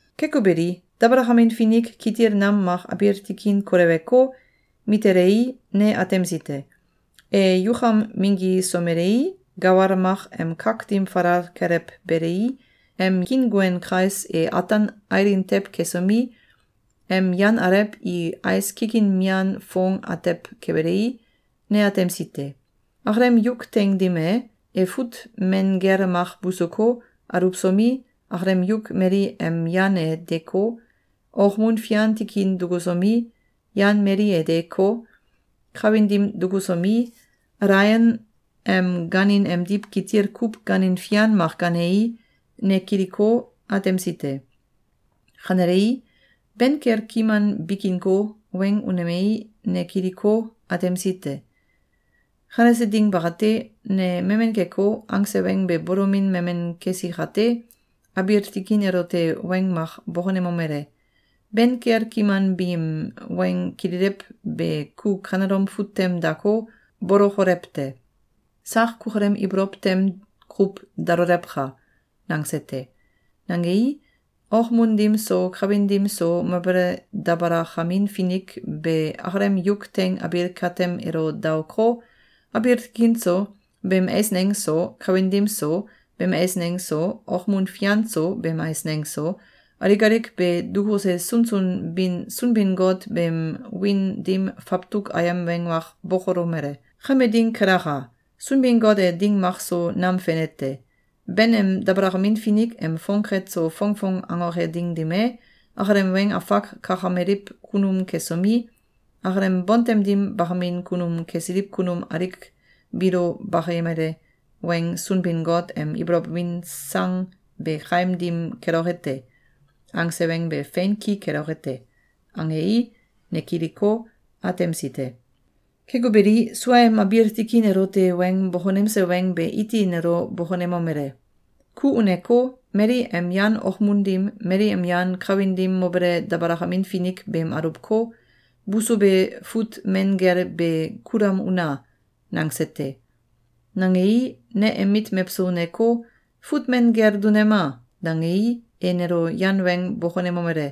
Keko beli, dabalakamin finik kitil nam mak abiil tikin koleweko, mitelei, ne atemsi te. E yukam minggisomelei, gawal mak em kak dim falal kelewbelei, em kiinguen kais e ataan ailin tew kesomi, em yan alew i ais kikin mian foong atew kebelei, ne atemsi te. Akalem yuk teing dim e, e fut men gel mak busuko, aluwsomi, akalem yuk mali em yan e deeko, okmun fian tikin dukusomi, yan mali e deeko, kawin dim dukusomi, alaion em gaanin emdiw kitil kuw gaanin fian mak gaanei, ne kiliko, atemsi te. Kanelei, ben kel kiman bikinko, weng unemei, ne kiliko, atemsi te. Kanese ding bakate, ne memen keko, angse weng be bolomin memen kesi kate, abiil tikin elote weng mak bokonemomele: “Ben kel kiman biim weng kililew be ku kanelom fut tem dako, bolokolew te! Sak kukalem ibolow tem kuw dalolewka!”, nangse te. Nangei, okmun dim so kawin dim so mobele dabalakamin finik be akalem yuk teing abiil katem elo daoko, abiil tikin so, beem eisneng so, kawin dim so, beem eisneng so, okmun fian so, beem eisneng so, alik alik be dukuse sunsun bin Sunbin-Got beem wiin dim fawtuk ayem weng mak bokolomele: “Kame ding kelaka! Sunbin-Got e ding mak so nam fene te. Ben em dabalakamin finik em fongket so fongfong angoke ding dim e, akalem weng afak kakameliw kunum kesomi, akalem bontem dim bakamin kunum kesiliw kunum alik biilo bakayemale weng ‘Sunbin-Got em ibolow win sang be kaim dim keloke te.’, angse weng be fein ki keloke te.”, angei, ne kiliko, atemsi te. Keko beli, suaem abiil tikin elote weng bokonemse weng be iti nelo bokonemomele: “Ku uneko, mali em yan okmun dim, mali em yan kawin dim mobele dabalakamin finik beem aluwko, busube fut men gel be kulam una!”, nangse te. Nangei, ne em mit mewso uneko, “Fut men gel dunema!”, dangei, e nelo yan weng bokonemomele: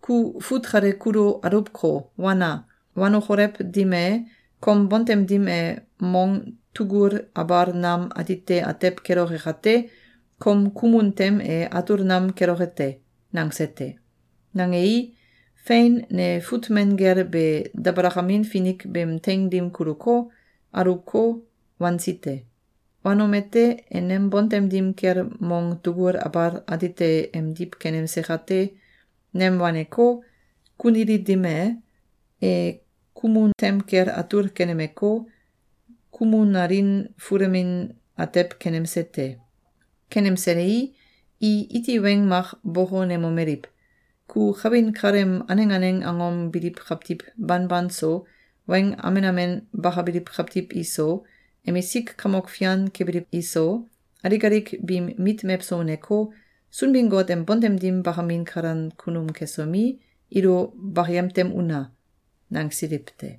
“Ku fut kale kulu aluwko, wana! Wanokolew dim e, kom bontem dim e mong tugul abal nam atite atew keloke kate, kom kumun tem e atul nam keloke te.”, nangse te. Nangei, fein, ne fut men gel be dabalakamin finik beem teing dim kuluko, aluwko, wansi te. Wanomete, e nem bontem dim kel mong tugul abal atite emdiw kenemse kate, nem waneko, kunili dim e, e kumun tem kel atul kenemeko, kumunalin fulemin atew kenemse te. Kenemselei, i iti weng mak bokonemomeliw: “Ku kawin kaleem aneng aneng angom biliw kawtiw banban so, weng amen amen bakabiliw kawtiw iso, emisik kamok fian kebiliw iso, alik alik biim mit mewso uneko, Sunbin-Got em bontem dim bakamin kalan kunum kesomi, ilo bakayem tem una!”, nangsiliw te.